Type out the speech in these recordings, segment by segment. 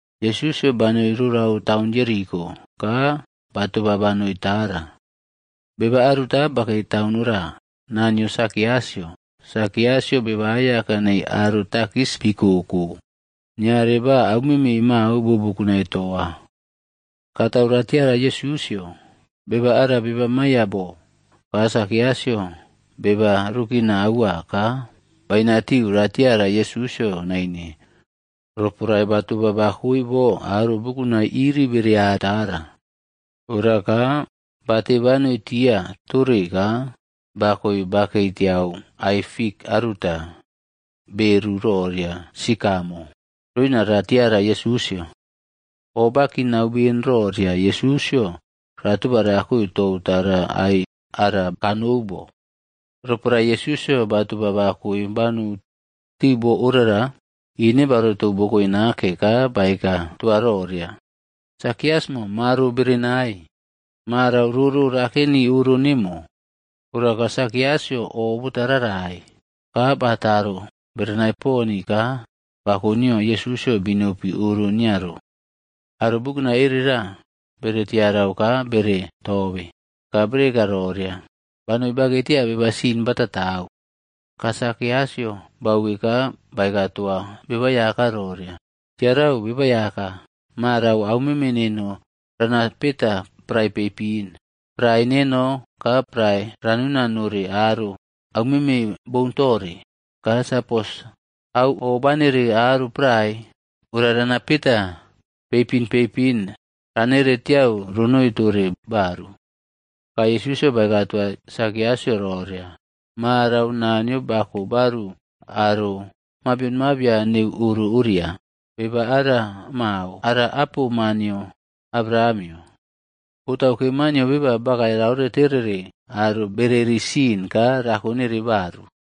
Yesusꞌyo banoi rorau taun Jeriko, ka batoba banoi tara. Beba aruta bakei taun ora, naa nio Sakiusꞌyo. Sakiusꞌyo beba aiyaka nei aro takis bikoꞌko, niare ba aumeme mao bo bukunai toa. Katau ratiara Yesusꞌyo, beba ara beba mayabo. Ka Sakiasꞌyo beba rukina aua ka bainatiu ratiara Yesusꞌyo naine roporae batoba bakoe bo aro bukunai iri bearia tara. Ora ka bate banoi tia tore ka bakoe bakei tiau ai fik aruta, beru roria “Sikamo” roina ra tiara Yesusꞌyo. Oꞌbakinau ben roria, Yesusꞌyo ratoba rakoe tou tara ai ara kanou bo. Roporae Yesusꞌyo batoba bakae banou tiu bo orara, ine baoretou bokoe nake ka baeka toa roria, “Sakiusꞌmo, maro berenai. Marau roro rakeni oro nemo.” Ora ka Sakiusꞌyo o bota rarai, ka bataro berenai poni ka bako nio Yesusꞌyo binopi oro nio ro. Aro bukunai erera bere tiarau ka bere tobe, ka bere eka roria, “Banoi bakei tia beba sin batatau.” Ka Sakiasꞌyo bauwe ka baeka toa Beba Aiyaka roria, “Tiarau, Beba Aiyaka! Marau aumeme neno rana peta prae peipin. Prae neno ka prae ranuna nore aro aumeme boun tore. Ka sapos au obanere aro prae, ora rana peta peipin peipin ranere tiau ronoi tore baru.” Ka Yesusꞌyo baeka toa Sakiusꞌyo roria, “Marau Naniyo bako baru aro mabion mabian neu oro oria. Beba ara mao, ara apo ma nio Abrahamꞌyo. Botauke Maa nio Beba bakae raore terere aro bereri sin ka rako nere baru.”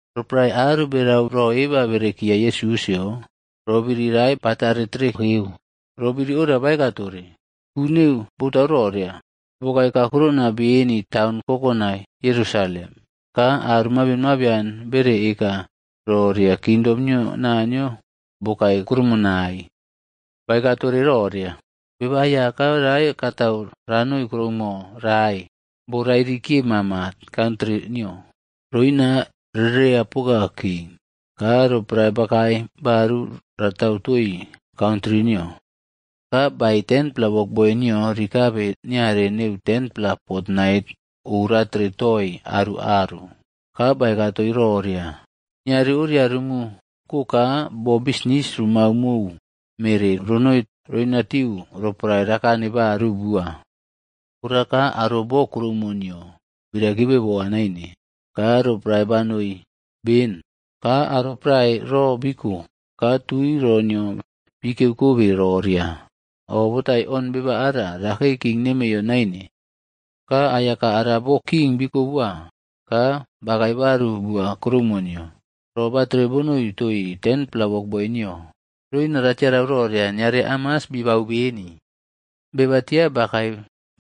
Roporae aro berau ro eba berekiya Yesusꞌyo, roꞌbiri rae batare terekeu. Ro biri ora baeka tore, ku neu botau roria, bokae kakurona ben taun kokonai Yerusalem, ka aro mabion mabian bere eka roria kingdom nio Naniyo bokae kuroumonai. Baeka tore roria, “Beba Aiyaka rae katau ranoi kuroumo rae borairi kiye mama kantri nio, roina rereiya poka king. Ka roporae bakae baru ratau toi kantri nio. Ka baei 10-pela wokboi nio rikabe niare neu 10-pela fotnait oꞌratere toii aru aru. Ka baeka toii roria, ‘Niare oria rumu ko ka bo bisnis rumau mou mere ronoi roinatiu roporae rakane baru bua.’ “Ora ka aro bo kuroumo nio bi raikibe boa naine, ka roporae banoi ben, ka aro prae ro biko ka tui ro nio bikiyeu kobe roria, ‘Oꞌbotaion beba ara, rakei king neiyo naine.’ “Ka aiyaka ara bo king bikobowa ka bakae baru bua kuroumo nio. Ro batere bonoi toii 10-pla wokboi nio, roina katau ratiarau roria niare hamas bibau beni. “Beba tia bakae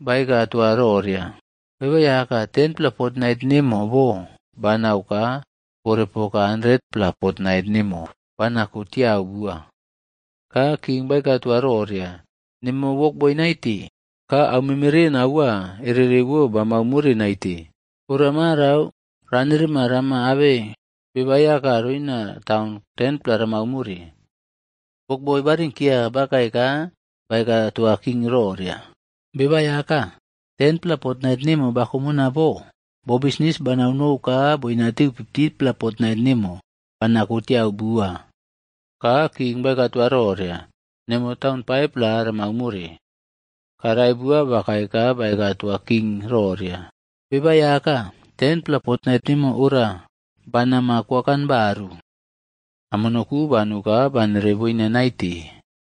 baeka toa roria, ‘Beba Aiyaka, 10-pla fotnait nemo bo banau ka bore poka 100-pla fotnai nemo banako tiau bua.’ “Ka king baeka toa roria, ‘Nemo wokboi naite. Ka aumemeren aua ererewo bamau more naite. Ora marau ranerema rama abe bebaꞌaiyaka roina taun 10-pla ramau more.’ “Wokboi ba rinkeya bakae ka baeka toa king roria, ‘Beba Aiyaka, 10-pla fotnait nemo bakomona bo, bo bisni banau nou ka boinatiu 50-pla fotnait nemo banako tiau bua.’ “Ka king baeka toa roria, ‘Nemo taun 5-pla ramau more.’ “Ka rae bua bakae ka baeka toa king roria, ‘Beba Aiyaka, 10-pla fotnait nemo ora, bana ma kokan baru. Amono ku banu ka banere boina naite.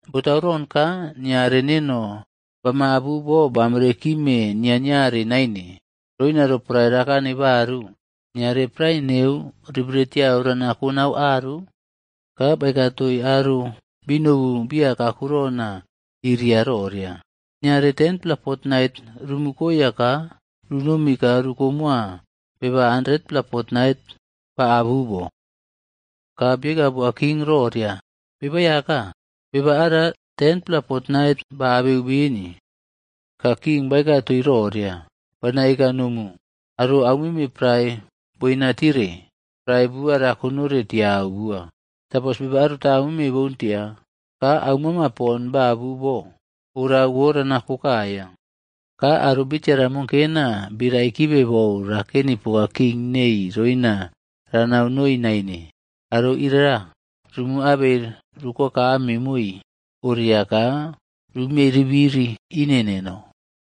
Botauron ka niare neno bamaꞌabu bo bamere kime niaꞌniarea naine, roina roporae rakane baru, niare prae neu ribere tiau rana konauu aru?’ “Ka baeka toii aro binobu bia kakurona iria roria, ‘niare 10-pla fotnait rumu koya ka runomi ka rukomowa beba 100-pla fotnait ba abu bo.’ “Ka bieka boa king roria, ‘Beba Aiyaka, beba ara 100-pla fotnait ba abeu beni.’ “Ka king baeka toii roria, ‘Bana eka nomu, aro aumeme prae boina tire, prae bua rakonore tiau bua. Sapos beba aruta aumeme boun tia, ka aumama pon baꞌabu bo, orawo ranako kaiya. Ka aro bitiara monkena bi raikibe bou raken poka king nei roina ranau noi naine, aro irara rumu abei rukowakame moi oria ka rumiei ribiri ine neno.’”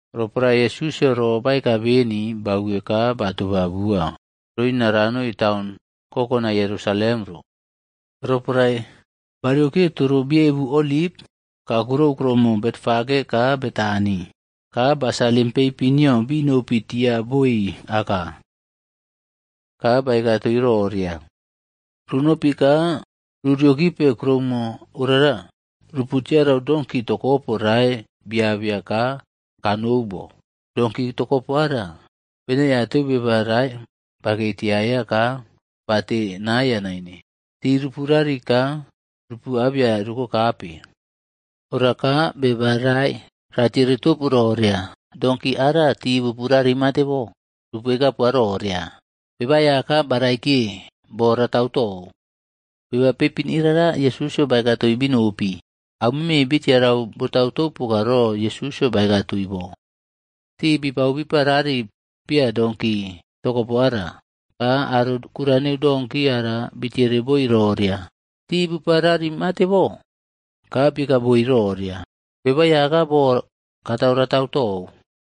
Roporae Yesusꞌyo ro baeka beni, bauwe ka batoba bua roina ranoi taun kokonai Yerusalem ro. Roporae bariokiye toro biebu Oliv, kakurou kuruomo Betfage ka Betani, ka ba salim peipin nio binopi tia boi aka. Ka baeka toii roria, “Runopi ka ru riokipe kuroumo orara. Rupu tiarau donki tokopo rae biabeya ka kanou bo. Donki tokopo ara, benaiateu beba rae bakei tiaiya ka bate naiya naine. Ti rupa rari ka rupu abeya rukokape. Ora ka beba rae ratiere topu roria, ‘Donki ara ti bupu rari matebo?’ Rupu eka poa roria, ‘Beba Aiyakab baraikiye bo ratau tou.’” Beba peipin irara Yesusꞌyo baeka toii binopi. Aumeme bi tiarau botaunau poka ro Yesusꞌyo baeka toii bo. Tii bipau bipa rari pia donki tokopo ara, ka aro kura neu donki ara bitiere boi roria, “Ti bupa rari mate bo?” Ka bieka boi roria, “Beba Aiyaka bo katau ratau tou.”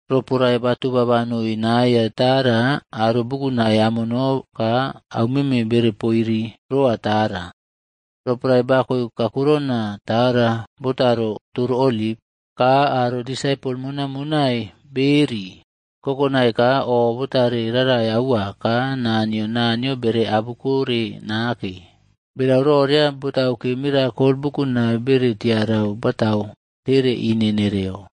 Roporae batoba banoi naya tara, aro bukunai amono ka aumeme bere poiri roa tara. Roporae bakoe kakurona tara botaro toro Oliv, ka aro disapol monaiꞌmonai beꞌeri kokonai ka o botare rarai aua ka naa nio Naniyo bere abukore nake. Berau roria botauke mirakol bukunai bere tiarau batau tere ine nereyo.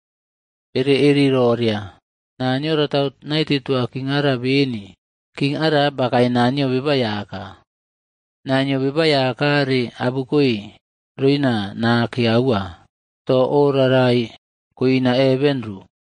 Bere eri roria, “Naniyo ratau naite toa king ara beni. King ara bakae naa nio Beba Aiyaka. Naa nio Beba Aiyaka re abukoe roina nake aua. To oꞌrarai koina heven ro.”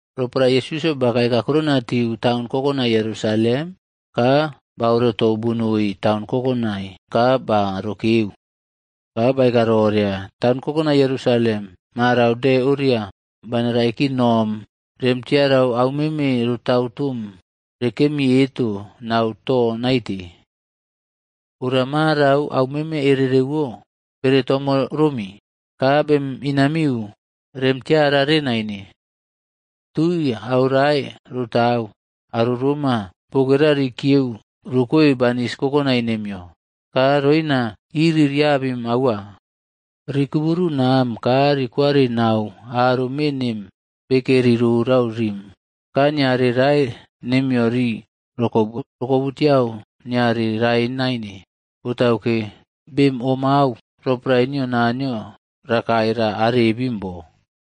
Roporae Yesusꞌyo bakae kakurona tiu taun kokonai Yerusalem,c ka baꞌorotou bonoi taun kokonai ka ba rokeu. Ka baeka roria, “Taun kokonai Yerusalem, marau de oria bana raikin nom rem tiarau aumeme rotau tom rekemi eto nau to naite. Ora marau au meme erereꞌwo bere tomo romi ka bem inamiu rem tiarare naine. Tui aurae rotau, aro roma bokera riꞌiku rokoe banis kokonai nemiyo. Ka roina iri riabem aua. Rikuburu nam ka rikwari nau aro me nem bekeri rorau rim. Ka niare rae nemiyo ri rokobu rokobutiau niare rae naine, botauke bemꞌomau roporae nio Naniyo rakae ra arebim bo.”